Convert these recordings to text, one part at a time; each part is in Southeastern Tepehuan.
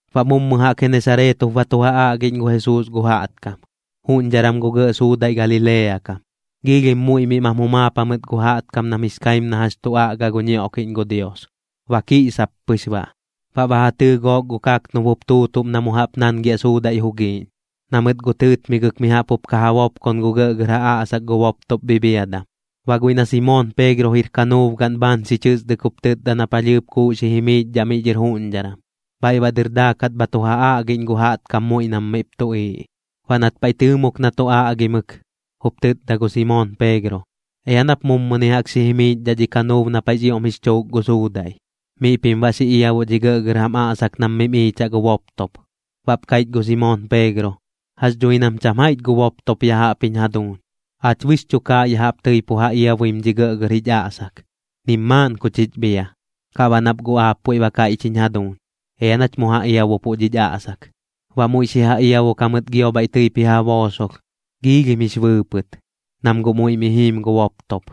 Baꞌ mummɨ jaꞌk Genesareet jup ba tu ja aꞌgiꞌñ gu Jesuus gu jaꞌtkam, juꞌñdharam gu gɇꞌ suudaiꞌ Galilea kam. Giilhim muiꞌ mim jumaap jamɨt gu jaꞌtkam nam jix kaim na jax tu aꞌga gu ñioꞌkiꞌñ gu Dios, ba kiꞌsap pɨx baꞌ. Baꞌ ba ja tɨɨ gook gu kaknub jup tuutuꞌm na mu jaꞌp nangiaꞌ suudaiꞌ jugiiꞌñ, na mɨt guꞌ tɨɨtmigɨk mi jaꞌp jup ka ja bopkon gu gɇꞌgɇr aꞌsak gu boptop bhibhiadam. Baꞌ guiꞌ na Simoon Peegro jir kanuub gaꞌn bhaan xi chɨsdɨk jup tɨtda na palhɨɨp kuuꞌ xi jimiichdhaꞌ miꞌ dhɨr juꞌñdharam, bhaiꞌ baꞌ dɨr daakat bha tu ja aꞌgiꞌñ gu jaꞌtkam muiꞌ nam miꞌp tuꞌiiꞌ. Baꞌ nat paiꞌ tɨɨmok na tu aꞌgimɨk, jup tɨtda gu Simoon Peegro: ―Ea nap mummɨni jaꞌk xi jimiichdhaꞌ dhi kanuub na paiꞌx ioꞌm jix chuuk gu suudaiꞌ, miꞌ pim baꞌ xi iabuꞌ dhi gɇꞌgɇr jam aꞌsak nam mim iichaꞌ gu boptop. Baꞌp kaiꞌch gu Simoon Peegro: ―Jax dhui nam cham jaiꞌch gu boptop ya jaꞌp jiñ jaduuñ. Aach bɨx chukaaꞌ ya jaꞌp tɨi pu ja iabuim dhi gɇꞌgɇr aꞌsak, nim maaꞌn ku chich bhia. Kaꞌ baꞌ nap guꞌ aap puiꞌ ba kaiꞌch jiñ jaduuñ, ea nach mu ja iabupuꞌ dhich aꞌsak. Baꞌ muiꞌ xi ja iabuk jamɨt gio bhaiꞌ tɨip ji ja boosolh. Giilhim jix bɨɨpɨt, nam guꞌ muiꞌ mi jiim gu boptop,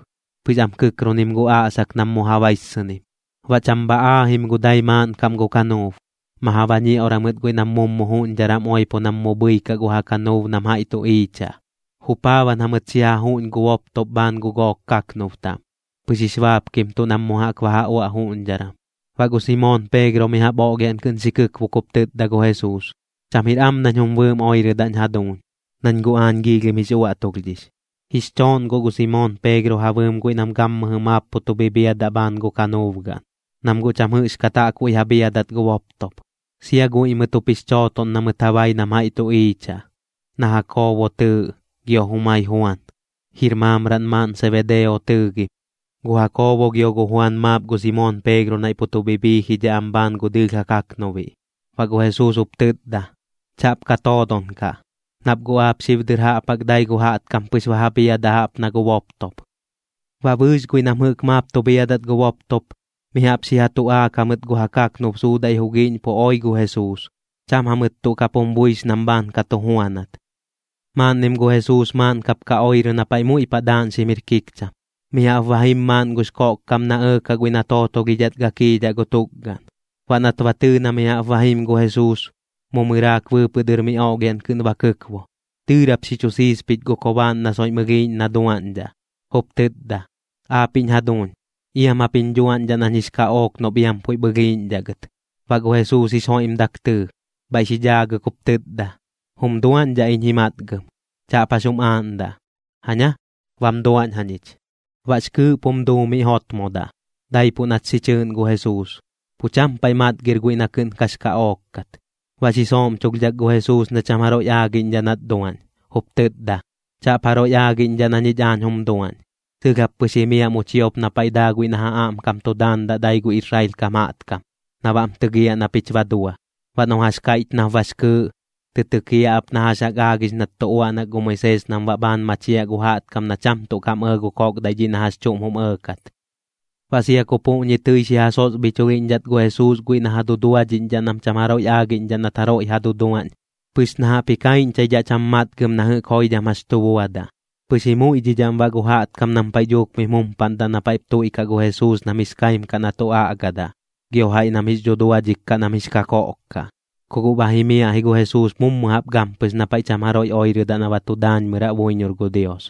pɨx am kɨkkrunim gu aꞌsak nam mu ja baissɨnim. Baꞌ cham bha aajim gu dai maaꞌn kaꞌm gu kanuub, ma ja bañioꞌra mɨt guiꞌ nam mummɨ juꞌñdharam oipo nam mu bhɨikaꞌ gu ja kanuub nam jaiꞌ tu iichaꞌ. Jupaaban jamɨt xi ja juꞌñ gu boptop bhaan gu gook kaknub taꞌm, pɨx jix baapkimtuꞌ nam mu jaꞌk ba ja uaꞌ juꞌñdharam. Baꞌ gu Simoon Peegro mi jaꞌp oꞌlhiaꞌn kɨꞌn xi kɨkbok jup tɨtda gu Jesuus: ―Cham jir am nañ jum bɨɨm oirɨdaꞌñ jaduuñ, nañ guꞌ aañ giilhim jix uaꞌtulhdhix. Jix chooꞌn guꞌ gu Simoon Peegro ja bɨɨm guiꞌ nam gammɨjɨ maap pu tu bhibhiadaꞌ bhaan gu kanuub gaꞌn, nam guꞌ cham jɨꞌxkat jaꞌkbuiꞌ ja bhiadat gu boptop. Sia guiꞌ mɨt jup jix chootoꞌn na mɨt ja bai nam jaiꞌ tu iichaꞌ, na Jakoobo tɨɨꞌ gio jumai Juan, jir maamraꞌn maaꞌn Sebedeo tɨɨgim. Gu Jakoobo gio gu Juan maap gu Simoon Peegro naiꞌ pu tu bhibhiijidhaꞌ am bhaan gu dɨɨlh ja kaꞌknubiꞌ. Baꞌ gu Jesuus jup tɨtda: ―Chaꞌp ka toodon kaꞌ, nap guꞌ aap xib dɨr jaꞌp jaꞌk dai gu jaꞌtkam pɨx ba ja bhiadaꞌ jaꞌp na gu boptop. Baꞌ bɨɨx guiꞌ nam jɨꞌk maap tu bhiadat gu boptop, mi jaꞌp xi ja tuꞌaak jamɨt gu ja kaknub suudaiꞌ jugiiꞌñ pu oi gu Jesuus. Cham jamɨt tuꞌ kap jum buix nam bhaan ka tu juanat. Maaꞌnnim gu Jesuus maaꞌn kap ka oirɨ na paiꞌ muiꞌ paꞌ daaꞌñxim jir kikcham. Mi jaꞌp ba jim maaꞌn gux koꞌkkam na ɇɇkaꞌ guiꞌ na tootolhidhat gakiidhaꞌ gu tukgaꞌn. Baꞌ nat ba tɨɨ na mi jaꞌp ba jim gu Jesuus, mu mɨraak bɨɨpɨꞌ dɨr mi oꞌlhiaꞌn kɨꞌn ba kɨkbo, dɨɨrap xi chu siispich gu kobaaꞌn na soiꞌm ɨlhiiꞌñ na duaꞌñdhaꞌ, jup tɨtda: ―Aapiꞌñ jaduuñ, iam jap jiñ dhuaꞌñdhaꞌ nañ jix kaꞌook noꞌp iam puiꞌp ɨlhiiꞌñdhaꞌ gɨt. Baꞌ gu Jesuus jix joiꞌmdak tɨɨ, bhaiꞌ xi dhaagɨk jup tɨtda: ―Jum duaꞌñdhaꞌ iñ ji matgɨm, chaꞌp jax jum aaꞌndaꞌ. Jaña, bam duaꞌñ jañich. Baꞌx kɨɨꞌp jum duu miꞌ jotmodaꞌ, daipuꞌ nat xi chɨɨꞌn gu Jesuus, pu cham paiꞌ matgir guiꞌ na kɨꞌn kax kaꞌook kat. Baꞌ xi sooꞌmchulhdhak gu Jesuus na cham jaroiꞌ aagiꞌñdhaꞌ nat duaꞌñ, jup tɨtda: ―Chaꞌp jaroiꞌ aagiꞌñdhaꞌ na ñich aañ jum duaꞌñ. Sɨlh jap pɨx jimiaꞌ mu chiop na paiꞌ daa guiꞌ na ja aꞌmkam tu daandaꞌ dai gu Israel kam jaꞌtkam, na baꞌm tɨgiaꞌ na pich ba dua. Baꞌ noꞌ jax kaiꞌch nap bax kɨɨꞌ, tɨ tɨkiaꞌ ap na jax jaꞌk aagix nat tu uaꞌnak gu Moisees nam baꞌ bhaan machiaꞌ gu jaꞌtkam na cham tuꞌ kam ɇɇ gu koꞌkdaiꞌ dhiꞌ na jax chuꞌm jum ɇɇkat. Baꞌ sia ku puꞌñi tɨi xi ja sosbhichulhiꞌñdhat gu Jesuus guiꞌ na ja duduadhiꞌñdhaꞌ nam cham jaroiꞌ aagiꞌñdhaꞌ nat jaroiꞌ ja duduaꞌñ, pɨx na jaꞌp ji kaiꞌñchaidhaꞌ cham matgɨm na jɨꞌk jax joidham tu buadaꞌ. Pɨx ji muiꞌdhidhaꞌm baꞌ gu jaꞌtkam nam paiꞌ dhuuk mim jumpaꞌndaꞌ na paiꞌp tuiꞌkaꞌ gu Jesuus nam jix kaim kaꞌ na tu aꞌgadaꞌ, gio jaiꞌ nam jix dhuduadhik kaꞌ nam jix kakoꞌk kaꞌ. Kuꞌ guꞌ ba jimiaꞌ ji gu Jesuus mummɨ jaꞌp gampɨx na paiꞌ cham jaroiꞌ oirɨdaꞌ na ba tu daañmɨraꞌ buiñor gu Dios.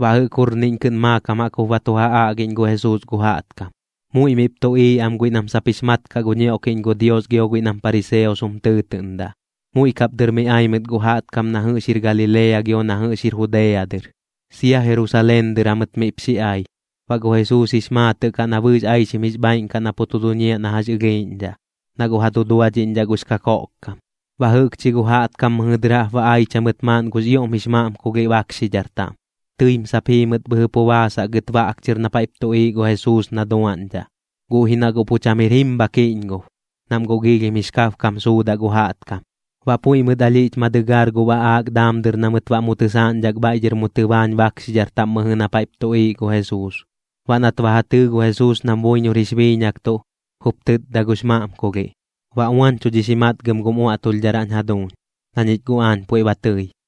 Baꞌ jɨꞌk jurniꞌñ kɨꞌn maakam jaꞌk jup ba tu ja aꞌgiꞌñ gu Jesuus gu jaꞌtkam. Muiꞌ miꞌp tuꞌiiꞌ am guiꞌ nam sap jix mat kaꞌ gu ñioꞌkiꞌñ gu Dios gio guiꞌ nam pariseos jum tɨɨtɨꞌndaꞌ, muiꞌ kap dɨr mi ai mɨt guꞌ gu jaꞌtkam na jɨꞌx jir Galilea gio na jɨꞌx jir Judea dɨr, sia Jerusaleen dɨr jamɨt miꞌp xi ai. Baꞌ gu Jesuus jix maatɨꞌ kaꞌ na bɨɨx aixim jix bhaaiꞌn kaꞌ na pu tu duñiaꞌ na jax ɨlhiiꞌñdhaꞌ, na guꞌ ja duduadhiꞌñdhaꞌ gux kakoꞌkkam. Baꞌ jɨꞌkchi gu jaꞌtkam mɨjɨ dɨr jaꞌp ba aich jamɨt maaꞌn gux ioꞌm jix maꞌmkulhiꞌ bakxidhar taꞌm. Tɨim sap jii mɨt bhɨjɨ pu baasaꞌ gɨt baꞌk chɨr na paiꞌp tuꞌiiꞌ gu Jesuus na duaꞌñdhaꞌ, guꞌ ji na guꞌ pu cham jir jim bha kiꞌñgob, nam guꞌ giilhim jix kabkam suudaꞌ gu jaꞌtkam. Baꞌ puiꞌ mɨt alhiꞌch ma dɨgaar gu baꞌaak daam dɨr na mɨt baꞌ mu tɨsaaꞌñdhak bhaiꞌ dhɨr mu tɨbaañ bakxidhar taꞌm mɨjɨ na paiꞌp tuꞌiiꞌ gu Jesuus. Baꞌ nat ba ja tɨɨ gu Jesuus nam buiñor jix biiñaktuꞌ, jup tɨtda gux maꞌmkulhiꞌ: ―Ba uañchudhix ji matgɨm gum uaꞌtulhdharaꞌñ jaduuñ, na ñich guꞌ aañ puiꞌ ba tɨi.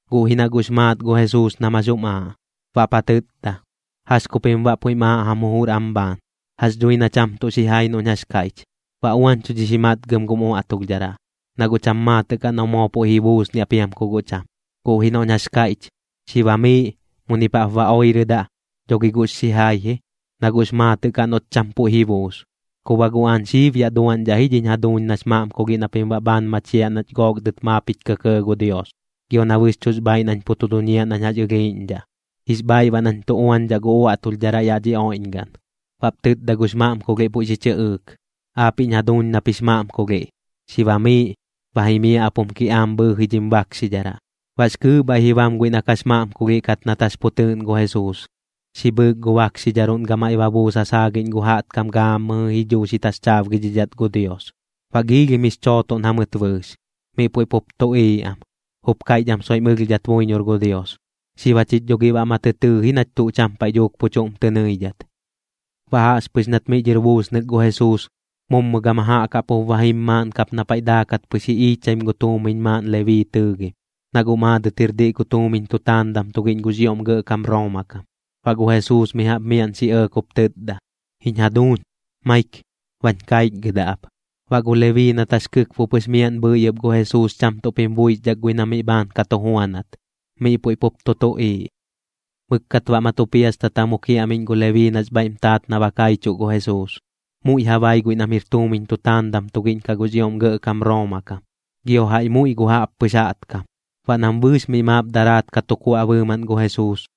Guꞌ ji na guꞌx maat gu Jesuus nam jax jum aaꞌ, baꞌp ja tɨtda: ―¿Jax ku pim baꞌ puiꞌm aaꞌ jam jujur am bhaan? Jax dhui na cham tuꞌ xijai noꞌñ jax kaiꞌch: “Ba uañchudhix ji matgɨm gum uaꞌtulhdharaꞌ”, na guꞌ cham maatɨꞌ kaꞌ noꞌ moo puiꞌ ji buusniaꞌ piam ku guꞌ cham. Guꞌ ji noꞌñ jax kaiꞌch: “Xi bamiiꞌ, munip jaꞌp ba oirɨdaꞌ”, dho gi guꞌx xijai ji, na guꞌx maatɨꞌ kaꞌ noꞌt cham puiꞌ ji buus. Ku baꞌ guꞌ aañ xib yaꞌ duaꞌñdhaꞌ ji dhiñ jaduuñ nax maꞌmkulhiꞌ na pim baꞌ bhaan machiaꞌ nach gook dɨt maap jich kɇkɇɇ gu Dios, gio na bɨxchuꞌx bhaaiꞌ nañ pu tu duñiaꞌ nañ jax ɨlhiiꞌñdhaꞌ. Jix bhaaiꞌ baꞌ nañ tu uañdhaꞌ gu uaꞌtulhdharaꞌ yaꞌ dhi oiꞌñgaꞌn. Baꞌp tɨtda gux maꞌmkulhiꞌ puiꞌ xi chɨꞌɨɨk: ―Aapiꞌñ jaduuñ nap jix maꞌmkulhiꞌ, xi bamiiꞌ, ba jimiaꞌ ap jum kiꞌaam bhɨɨji dhim bakxidharaꞌ. Baꞌx kɨɨꞌ bhaiꞌ ji bam guiꞌ na kax maꞌmkulhiꞌ kat nat jax pu tɨɨꞌn gu Jesuus, xi bhɨɨk gu bakxidharuꞌn gamaiꞌ ba buus ja saagiꞌñ gu jaꞌtkam gaammɨjɨ ji dhuu xi taxchaabgidhidhat gu Dios. Baꞌ giilhim jix chootoꞌn jamɨt bɨɨx, miꞌ puiꞌ pup tuꞌiiꞌ am. Jup kaiꞌch am soiꞌm ɨlhdhat buiñor gu Dios: ―Xib jachich dho gi baꞌ ma tɨ tɨɨ ji nach tuꞌ cham paiꞌ dhuuk pu chuꞌm tɨ nɨidhat. Baꞌ jaꞌxpɨx nat miꞌ dhɨr buusnɨk gu Jesuus, mummɨ gama jaꞌk jaꞌp jup ba jim maaꞌn kap na paiꞌ daakat pɨx ji iichaim gu tuumiñ maaꞌn Lebii tɨɨgim, na guꞌ maadɨt jir diꞌ gu tuumiñ tutaandam tugiꞌñ gux ioꞌm gɇꞌkam Rooma kam. Baꞌ gu Jesuus mi jaꞌp miaꞌn xi ɇɇk jup tɨtda: ―Jiñ jaduuñ, maik, bañ kaichgɨdaꞌ ap. Baꞌ gu Lebii nat jax kɨkbo pɨx miaꞌn bhɨi ɨp gu Jesuus cham tuꞌp jim buixdhak guiꞌ na miꞌ bhaan ka tu juanat, miꞌ puiꞌ pup tu tuꞌiiꞌ. Mɨkkat baꞌ ma tu piastata mu kiaꞌmiꞌñ gu Lebii nax bhaiꞌm taat na ba kaichuꞌ gu Jesuus. Muiꞌ ja bai guiꞌ nam jir tuumiñ tutaandam tugiꞌñ kaꞌ gux ioꞌm gɇꞌkam Rooma kam, gio jaiꞌ muiꞌ gu jaꞌppɨx jaꞌtkam. Baꞌ nam bɨɨx miꞌ maap daraat ka tu kuaꞌ bɨɨmaꞌn gu Jesuus,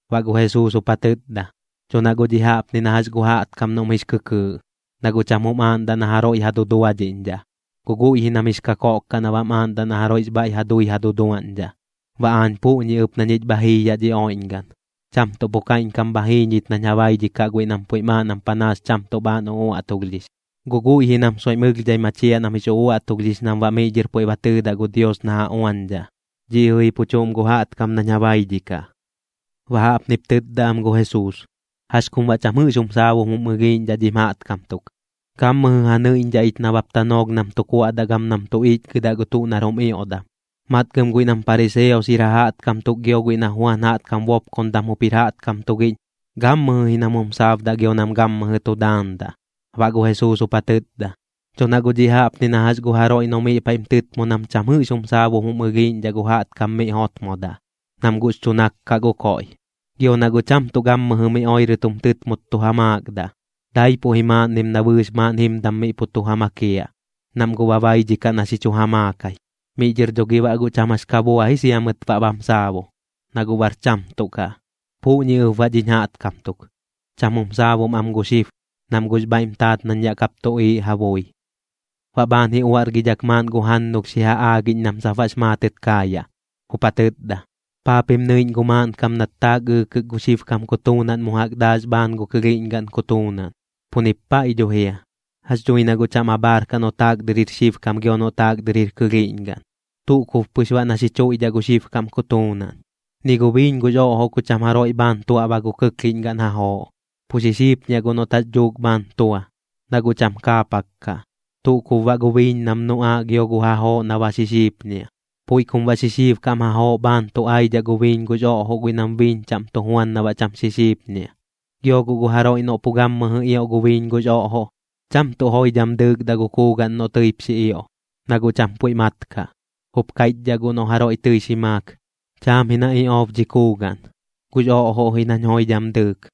Baꞌ gu Jesuus jup ja tɨtda: ―Dho na guꞌ dhiꞌ jaꞌpni na jax gu jaꞌtkam noꞌm jix kɨkɨɨꞌ, na guꞌ cham jum aaꞌndaꞌ na jaroiꞌ ja duduadhiꞌñdhaꞌ, guꞌ guiꞌ ji nam jix kakoꞌk kaꞌ na baꞌm aaꞌndaꞌ na jaroiꞌx bhaiꞌ ja dui ja duduaꞌñdhaꞌ. Baꞌ aañ puꞌñi ɨp na ñich bha jii yaꞌ dhi oiꞌñgaꞌn, cham tuꞌ pu kaiꞌñkam bha jii ñich nañ ja baidhikaꞌ guiꞌ nam puiꞌm aaꞌ nam panaas cham tuꞌ bhaan uꞌuaꞌtulhdhix, guꞌ guiꞌ ji nam soiꞌm ɨlhdhai machiaꞌ nam jix uaꞌtulhdhix nam baꞌ miꞌ dhɨr puiꞌ ba tɨɨdaꞌ gu Dios na ja uañdhaꞌ. Dhiꞌ jɨꞌ ji pu chuꞌm gu jaꞌtkam nañ ja baidhikaꞌ. Baꞌ jaꞌpnip tɨtda am gu Jesuus: ―Jax kum baꞌ cham jɨꞌx jum saabum jum ɨlhiiꞌñdhaꞌ dhim jaꞌtkam tuk. Gammɨjɨ ja nɨiꞌñdhaꞌ ich nabap tanoolh nam tu kuaꞌdaꞌ gam nam tu ichgɨdaꞌ gu tuꞌ nar jum ioꞌdam. Matgɨm guiꞌ nam pariseos jir ja jaꞌtkam tuk gio guiꞌ na Juan jaꞌtkam bopkondam jup jir jaꞌtkam tugiꞌñ, gammɨjɨ ji nam jum saabdaꞌ gio nam gammɨjɨ tu daandaꞌ. Baꞌ gu Jesuus jup ja tɨtda: ―Dho na guꞌ dhiꞌ jaꞌpni na jax gu jaroiꞌ noꞌ miꞌ paiꞌm tɨtmo nam cham jɨꞌx jum saabum jum ɨlhiiꞌñdhaꞌ gu jaꞌtkam miꞌ jotmodaꞌ, nam guꞌx chu nak kaꞌ gu koiꞌ. Gio na guꞌ cham tuꞌ gammɨjɨ mi oirɨt jum tɨtmot tu ja maakdaꞌ, daipuꞌ ji maaꞌnnim na bɨɨx maaꞌn jimdam miꞌ pu tu ja makiaꞌ, nam guꞌ ba baidhikaꞌ na xi chu ja maakai. Miꞌ dhɨr dho gi baꞌ guꞌ cham jax ka bua ji sia mɨt baꞌ bam saabu, na guꞌ bar cham tuꞌ kaꞌ. Puꞌñi ɨp baꞌ dhiñ jaꞌtkam tuk, cham jum saabum am gu xib, nam guꞌx bhaiꞌm taat nañ yaꞌ kap tuꞌiiꞌ ja bui. Baꞌ bhaan ji uaꞌrgidhak maaꞌn gu jannulh xi ja aagiꞌñ nam sap baꞌx maatɨt kaayaꞌ, jup ja tɨtda: ―¿Paa pim nɨiꞌñ gu maaꞌnkam nat taak ɨɨkɨk gu xibkam kutuunaꞌn mu jaꞌk daax bhaan gu kɨlhiꞌñgaꞌn kutuunaꞌn? Pu nip paiꞌ dho jia. Jax dhui na guꞌ cham abhaar kaꞌ noꞌ taak dɨr jir xibkam gio noꞌ taak dɨr jir kɨlhiiꞌñgaꞌn, tuꞌ kub pɨx baꞌ na xi chuiꞌdhaꞌ gu xibkam kutuunaꞌn. Ni gu biiñ gux oꞌjoꞌ ku cham jaroiꞌ bhaan tuaꞌba gu kɨklhiꞌñgaꞌn jajooꞌ, pu xixiipñiaꞌ guꞌ noꞌt jax dhuuk bhaan tua, na guꞌ cham ka kaapak kaꞌ, tuꞌ kub baꞌ gu biiñ nam nuꞌaaꞌ gio gu jajooꞌ na ba xixiipñiaꞌ. Puiꞌ kum baꞌ xixiibkam jajooꞌ bhaan tu aidhaꞌ gu biiñ gux oꞌjoꞌ guiꞌ nam biiñ chaꞌm tu juan na baꞌ cham xixiipñiaꞌ. Gio guꞌ gu jaroiꞌ noꞌ pu gammɨjɨ ioꞌ gu biiñ gux oꞌjoꞌ, cham tuꞌ joidham dɨɨkdaꞌ gu kuugaꞌn noꞌ tɨip xi ioꞌ, na guꞌ cham puiꞌ mat kaꞌ. Jup kaiꞌchdhaꞌ guꞌ noꞌ jaroiꞌ tɨi xi maak: “Cham ji na iꞌoob dhi kuugaꞌn, gux oꞌjoꞌ ji nañ joidham dɨɨk.”